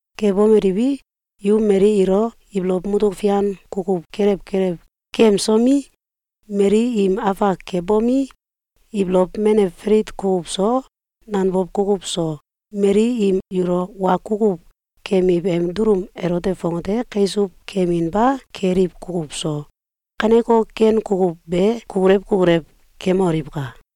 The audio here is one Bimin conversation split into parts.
Kebomeliwi, yu mali ilo ibolow mutuk fian kukuw kelew kelew kemsomi, mali im afak kebomi, ibolow menew falit kukuw so, nanbow kukuw so, mali im yulo wa kukuw keyemiw em dulum elote fongate kaisuw keyeminba keliw kukuw so, kaneko ken kukuw be kukulew kukulew kemoliwka!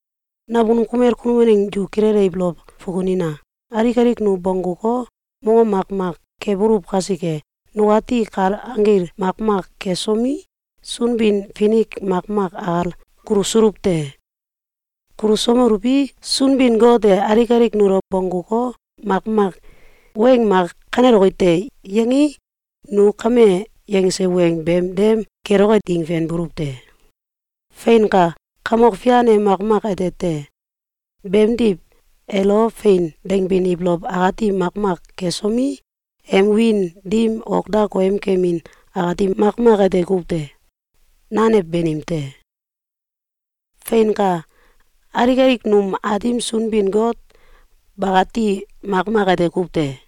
Nakunum kumel kunum waneng yu kilele ibolow fukunina! Alik alik nu bongguko, mongom makmak kebuluw kasike, nukati kal anggil makmak kesomi, Sunbin-Finik makmak akal kulusuluw te. Kulusomeluwi, Sunbin-Got e alik alik nulo bongguko, makmak weng mak “Kaneloki te!”, yangei, nu kame yangse weng beem dem keloke ding fenbuluw te. Feinka! Kamok Fian e makmak ete te. Beemdiw, elo “Fein!”, dangbin ibolow akati makmak kesomi, em wiin dim ok da koyemkemin akati makmak ete kuw te. Nanew banim te. Feinka! Alik alik num Aatim Sunbin-Got bakati makmak ete kuw te.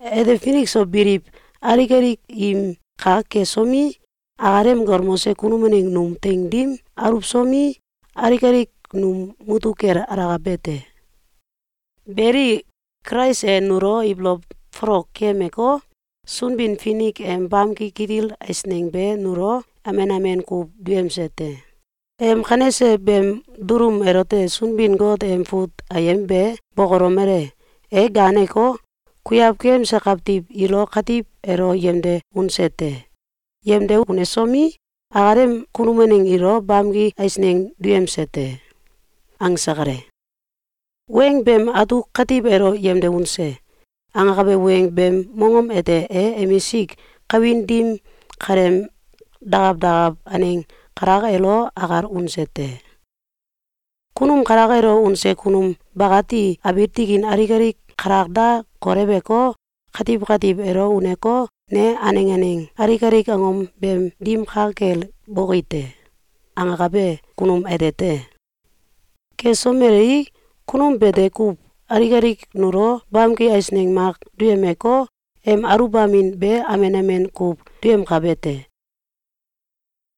Ete finik so biliw alik alik im kak kesomi, akalem galmose kunum waneng num teing dim aluwsomi, alik alik num mutuk kel alakabe te. Beli, Kulais e nulo ibolow folok keyemeko, Sunbin-Finik em bamki kitil eisneng be nulo amen amen kuw duyemse te. Em kanese beem dulum elote Sunbin-Got em fut ayem be bokolomele: “E ganeko, kuiaw keyemse kawtiw ilo katiw elo yemde unse te. Yemde unesomi, akalem kunum waneng ilo bamki eisneng duyemse te.”, angse kale. Weng beem atuk “katiw elo yemde unse” angakabe weng beem mongom ete e emisik kawin dim kaleem dakaw dakaw aneng kalak elo akal unse te. Kunum kalak elo unse kunum bakati abiil tikin alik alik kalak da koleweko, katiw katiw elo uneko, “Ne aneng aneng alik alik angom beem dim ka kel boki te.”, angakabe kunum ete te. Kesomelei, kunum bete kuw alik alik nulo bamki eisneng mak duyemeko, em aluwbamin be amen amen kuw duyemkabe te.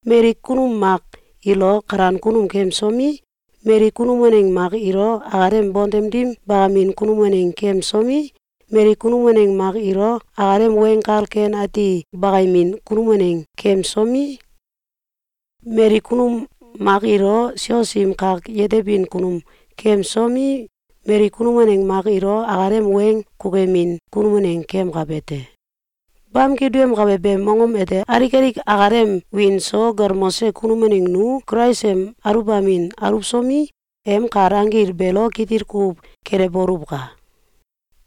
Mali kunum mak ilo kalan kunum keyemsomi, mali kunum waneng mak ilo akalem bontem dim bakamin kunum waneng keyemsomi, mali kunum waneng mak ilo akalem Weng Kal Ken Ati bakayemin kunum waneng keyemsomi, mali kunum mak ilo sios im kak yetebin kunum keyemsomi, mali kunum waneng mak ilo akalem weng kukuyemin kunum waneng keyemkabe te. Bamki duyemkabe beem mongom ete alik alik akalem wiin so galmose kunum waneng nu Kulais em aluwbamin aluwsomi, em kal anggil beelo kitil kuw kelewboluwka!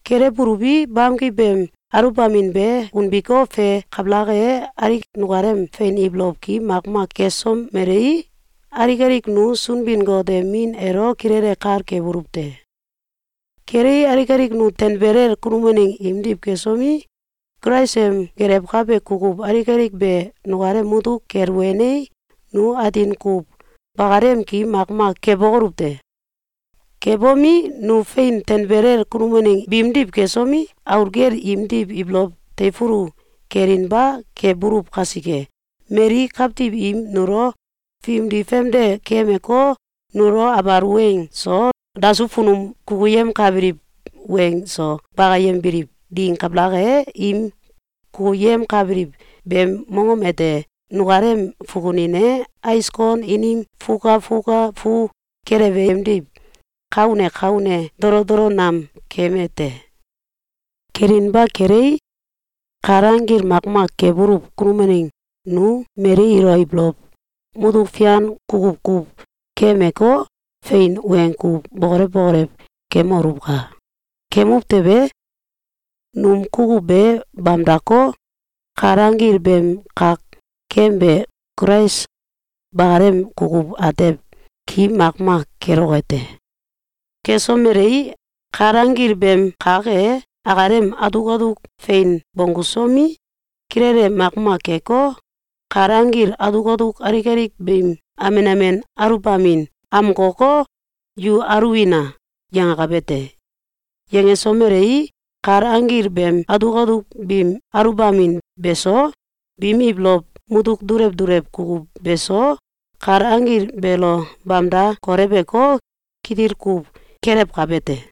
Kelewbuluwi, bamki beem aluwbamin be unbiko, fe kabalak e, alik nukalem fein ibolow ki makmak kesomelei, alik alik nu Sunbin-Got em Min elo kilele kal kebuluw te. Kelei, alik alik nu tanbelel kunum waneng imdiw kesomi, Kulais em gelewkabe kukuw alik alik be nukalem mutuk kel wenei, nu atin kuw bakalem ki makmak kebokoluw te. Kebomi, nu fein tanbelel kunum waneng biimdiw kesomi, aul gel imdiw ibolow teifulu kelinba kebuluw kasike, mali kawtiw im nulo fimdi famde keyemeko, nulo abal weng so dasuw funum kukuyemkabiliw weng so bakayembiliw ding kabalak e, im kukuyemkabiliw beem mongom ete nukalem fukunin e ais kon inim fukafuka fu kelewe emdiw ka une ka une dolodolo nam keeme te. Kelinba kelei, kal anggil makmak kebuluw kunum waneng nu mali ilo ibolow mutuk fian kukuw kuw keyemeko, fein weng kuw bokolew bokolew kemoluwka! Kemuw tewe, num kukuw be bamdako, kal anggil beem kak kebe Kulais bakalem kukuw atew ki makmak keloke te. Kesomelei, kal anggil beem kak e akalem atuk atuk fein bonggusomi, kilele makmak keko, kal anggil atuk atuk alik alik biim amen amen aluwbamin amkoko, “Yu aluwina!”, yangakabe te. Yangesomelei, kal anggil beem atuk atuk biim aluwbamin be so, biim ibolow mutuk dulew dulew kukuw beso, kal anggil beelo bamda koleweko, kitil kuw kelewkabe te.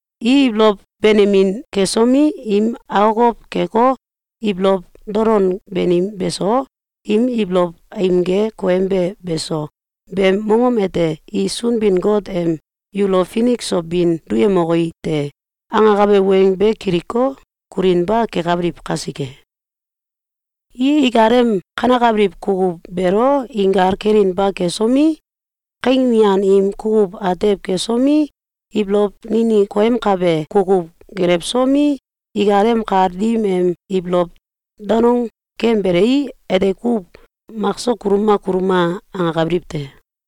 i ibolow benemin kesomi, im akokow keko, ibolow dolon banim beso, im ibolow aimge koyembe beso, beem mongom ete i Sunbin-Got em “Yulo finik so bin duyemoki te!”, angakabe weng be kiliko, kulinba kekabiliw kasike. I ikalem kanakabiliw kukuw beelo inkal kelinba kesomi, kaing mian im kukuw atew kesomi, ibolow ninik koyemkabe kukuw gelewsomi, ikalem kal dim em ibolow danong keyembelei, ete kuw “Mak so kuluma! Kuluma!”, angakabiliw te.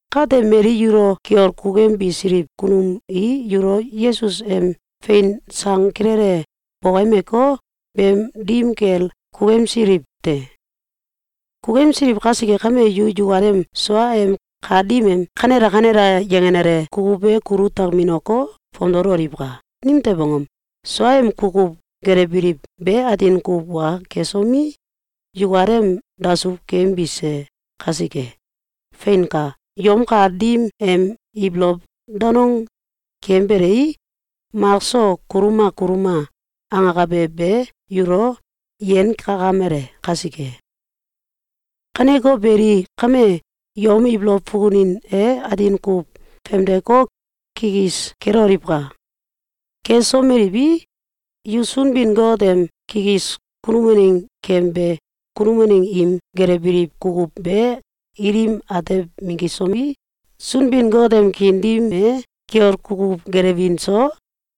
Kate, mali yulo kiol kukuyembisiliw kunum i yulo Yesus em fein sang kilele bokoyemeko, beem dim kel kukuyemsiliw te. Kukuyemsiliw kasike kame, yu yukalem suaem kal dim em “Kanela! Kanela!”, yangenale kukuw be kulu takminoko, fomdololiwka! Nimtew angom? Suaem kukuw gelewbiliw be atin kuw wa kesomi, yukalem dasuw keyembise kasike. Feinka! Yom kal dim em ibolow danong keyembelei, “Mak so kuluma! Kuluma!”, angakabe be yulo yenkakamele kasike. Kaneko beli, kame, yom ibolow fukunin e atin kuw famdeko, kikis keloliwka! Kesomeliwi, yu Sunbin-Got em kikis kunum waneng keyembe kunum waneng im gelewbiliw kukuw be ilim atew minggisomi, Sunbin-Got em kiin dim e kiol kukuw gelewin so,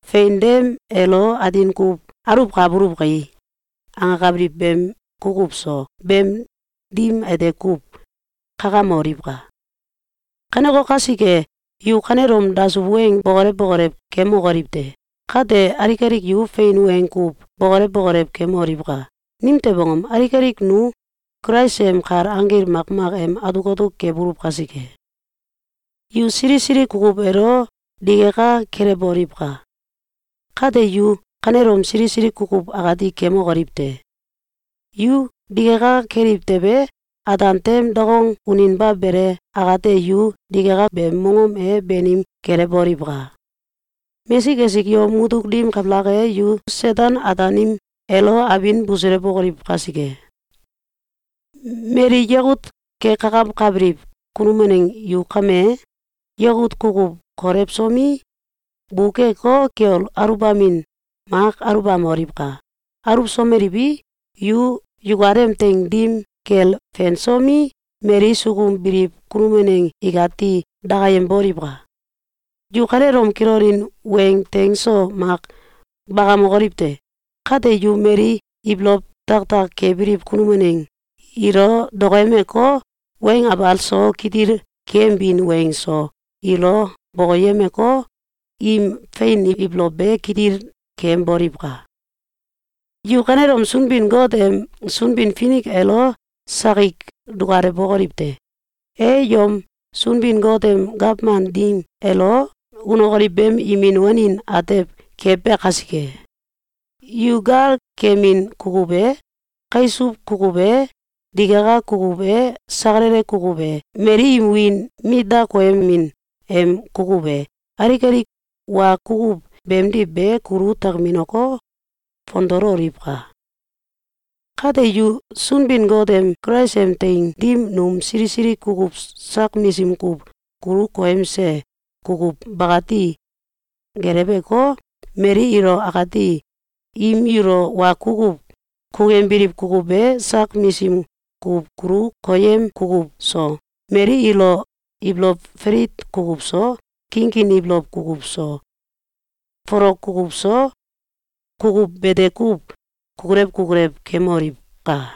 “Fein dem elo atin kuw aluwkabuluw kai!”, angakabiliw beem kukuw so, beem dim ete kuw kakamoliwka! Kaneko kasike, yu kanelom dasuw weng bokolew bokolew kemokoliw te! Kate, alik alik yu fein weng kuw bokolew bokolew kemoliwka! Nimtew angom? Alik alik nu Kulais em kal anggil makmak em atuk atuk kebuluw kasike. “Yu sili sili kukuw elo digaka kelewboliwka! Kate, yu kanelom sili sili kukuw akati kemokoliw te!” Yu digaka keliw tewe, ataan tem dakong uninba bele akate, yu digaka beem mongom e banim kelewboliwka! Mesik esik yom mutuk dim kabalak e, yu Seten-Ataanim elo abin busulewokoliw kasike. Mali yakut kekakawkabiliw kunum waneng yu kame, yakut kukuw kolewsomi, bukeko, kiol aluwbamin mak aluwbamoliwka! Aluwsomeliwi, yu yukalem teing dim kel fensomi, mali sukum biliw kunum waneng ikati dakayemboliwka! Yu kanelom kilonin weng teng so mak bakamokoliw te! Kate yu mali ibolow tiaktiak kebiliw kunum waneng ilo dokoyemeko, weng abal so, kitil keyembin weng so, ilo bokoyemeko, im fein ibolow be kitil keyemboliwka! Yu kanelom Sunbin-Got em Sunbin-Finik elo sakik dukalewbokoliw te! E yom Sunbin-Got em gawman dim elo unokoliw beem imin wanin atew kebe kasike. Yu gal keyemin kukuw e, kaisuw kukuw e, digaka kukuw e, sakalala kukuw e, mali im wiin mit da koyemin em kukuw e, alik alik wa kukuw beemdiw be kulu takminoko, fomdololiwka! Kate, yu Sunbin-Got em Kulais em teing dim num sili sili kukuw sak misim kuw kulu koyemse kukuw bakati geleweko, mali ilo akati im yulo wa kukuw kukuyembiliw kukuw be sak misim kuw kulu koyem kukuw so, mali ilo ibolow falit kukuw so, kinkin ibolow kukuw so, folok kukuw so, kukuw bete kuw kukulew kukulew kemoliwka!